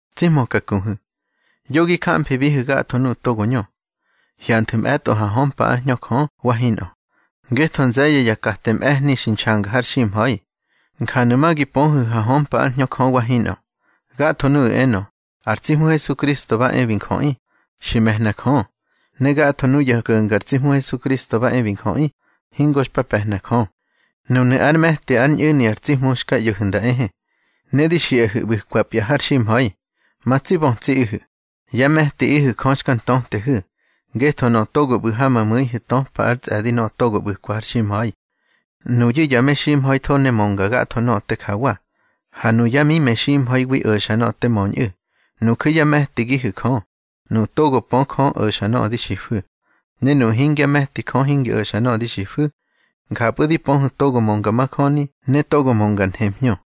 Tsi hmöka kuhu̱, yo gi jamfibihu̱ gatho nuꞌu̱ togo ñö. Hyanthu̱ mꞌe̱tꞌo ha hömpa ár Hñö Jö wa hinꞌö, ngetho nze̱ye̱ ya kate mꞌe̱hni xi nxanga har ximha̱i. Njanu̱ ma gi pöhu̱ ha hömpa ár Hñö Jö wa hinꞌö: Gatho nuꞌu̱ enö, ar tsi Hmu Hesukristo ba e bi njöꞌi, xi me̱hna Jö. Ne gatho nuya ko̱nga ar tsi Hmu Hesukristo ba e bi njöꞌi, hingo xpa pe̱hna Jö. Nunu̱ ár me̱ti ár ñꞌu̱ni ar tsi Hmu xka ꞌyo̱hu̱ nda ehe, ne di xiꞌahu̱ ꞌbu̱kwapya har ximha̱i. Ma tsi bötsiꞌihu̱, yá me̱tiꞌihu̱ Jö xka ntötehu̱, ngetho nöꞌö togo ꞌbu̱ ha ma mu̱ihu̱ töpa ár tsꞌe̱di nöꞌö togo ꞌbu̱kwa har ximha̱i. Nuyu̱ ya meximha̱itho ne mönga gatho nöꞌö te jawa, ha nuyá mimeximha̱iwi o̱xa nöꞌö te möñꞌu̱. Nuju̱ yá me̱tigihu̱ Jö, nuꞌu̱ togo pö Jö o̱xa nöꞌö di xifu̱. Ne nuꞌu̱ hingyá me̱ti Jö hingi o̱xa nöꞌö di xifu̱. Njapꞌu̱ di pöhu̱ togo mönga majöni ne togo mönga ar nhemhñö.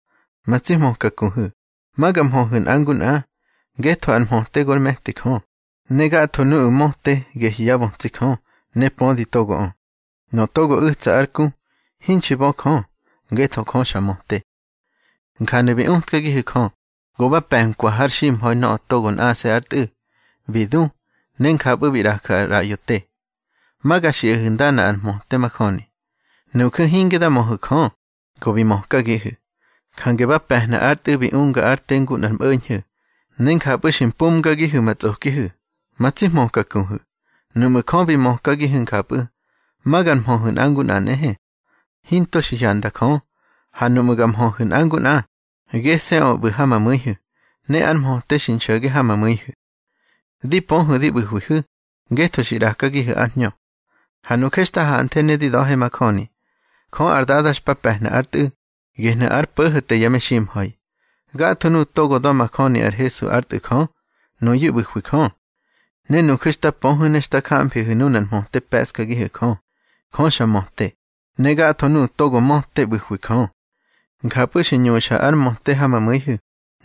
Ma tsi hmöka kuhu̱, ma ga nmhöhu̱ nꞌa ngu nꞌa, ngetho ar mhöte gor me̱ti Jö, ne gatho nuꞌu̱ möte gehyu̱ yá bötsi Jö, ne pödi togoꞌö. Nöꞌö togo u̱tsa ár ku, hinxi bö Jö, ngetho Jö xa möte. Njanu̱ bi utkagihu̱ Jö, go ba pe̱nkwa har ximha̱i nöꞌö nꞌase̱ ár Tꞌu̱, bi du, ne njapꞌu̱ bi ꞌraju̱ ar ꞌraꞌyo te. Ma ga xiꞌahu̱ ndana ar mhöte majöni: Nuju̱ hinge da möhu̱ Jö, go bi mökagihu̱. Jange ba pe̱hna ár Tꞌu̱ bi unga ár te ngu nꞌar mꞌo̱ñho̱, ne njapꞌu̱ xi mpumgagihu̱ ma tsꞌokihu̱. Ma tsi hmöka kuhu̱, nuꞌmu̱ Jö bi mökagihu̱ njapꞌu̱, ma ga nmhöhu̱ nꞌa ngu nꞌa nꞌehe. Hinto xi hyanda Jö, ha nuꞌmu̱ ga nmhöhu̱ nꞌa ngu nꞌa, gese̱ꞌö ꞌbu̱ ha ma mu̱ihu̱, ne ár mhöte xi nxo̱ge ha ma mu̱ihu̱. Di pöhu̱ di ꞌbu̱hwihu̱, ngetho xi ꞌrakagihu̱ ár Hñö. Ha nuje xta hanthe ne di da̱he majöni, Jö ar Dada xpa pe̱hna ár Tꞌu̱, gehnu̱ ár Po̱ho̱te ya meximha̱i. Gatho nuꞌu̱ togo da̱majöni ar Hesu ár Tꞌu̱ Jö, nuyu̱ ꞌbu̱hwi Jö. Ne nuju̱ xta pöhu̱ ne xta jamfihu̱ nunar mhöte pe̱ꞌskagihu̱ Jö. Jö xa möte, ne gatho nuꞌu̱ togo möte ꞌbu̱hwi Jö. Njapꞌu̱ xi ñuxa ár mhöte ha ma mu̱ihu̱,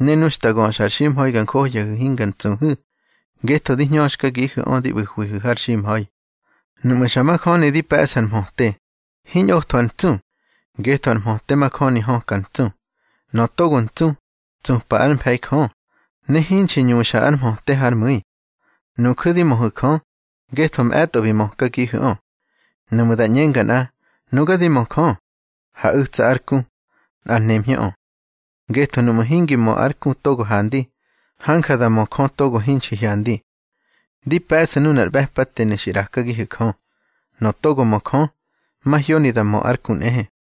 ne nu xta göxa ar ximha̱i ga njohyahu̱ hinga ntsuhu̱, ngetho di hñöxkagihu̱ꞌö di ꞌbu̱hu̱wa har ximha̱i. Nuꞌmu̱ xa majöni di pe̱ꞌsu̱ ar mhöte, hiñꞌotho ar ntsu, ngetho ar mhöte majöni höka ar ntsu. Nöꞌö togo ntsu, tsupa ár mfe̱i Jö, ne hinxi ñuxa ár mhöte hár mu̱i. Nuju̱ di möhu̱ Jö, ngetho mꞌe̱tꞌo bi mökagihu̱ꞌö. Nuꞌmu̱ da ꞌñenga nꞌa: Nuga di mö Jö, ha u̱tsa ár ku, nꞌar nemhñöꞌö. Ngetho nuꞌmu̱ hingi mö ár ku togo handi, hanja da mö Jö togo hinxi hyandi. Di pe̱ꞌsu̱ nunar ꞌbe̱patenu̱ xi ꞌrakagihu̱ Jö: Nöꞌö togo mö Jö, mahyoni da mö ár ku nꞌehe.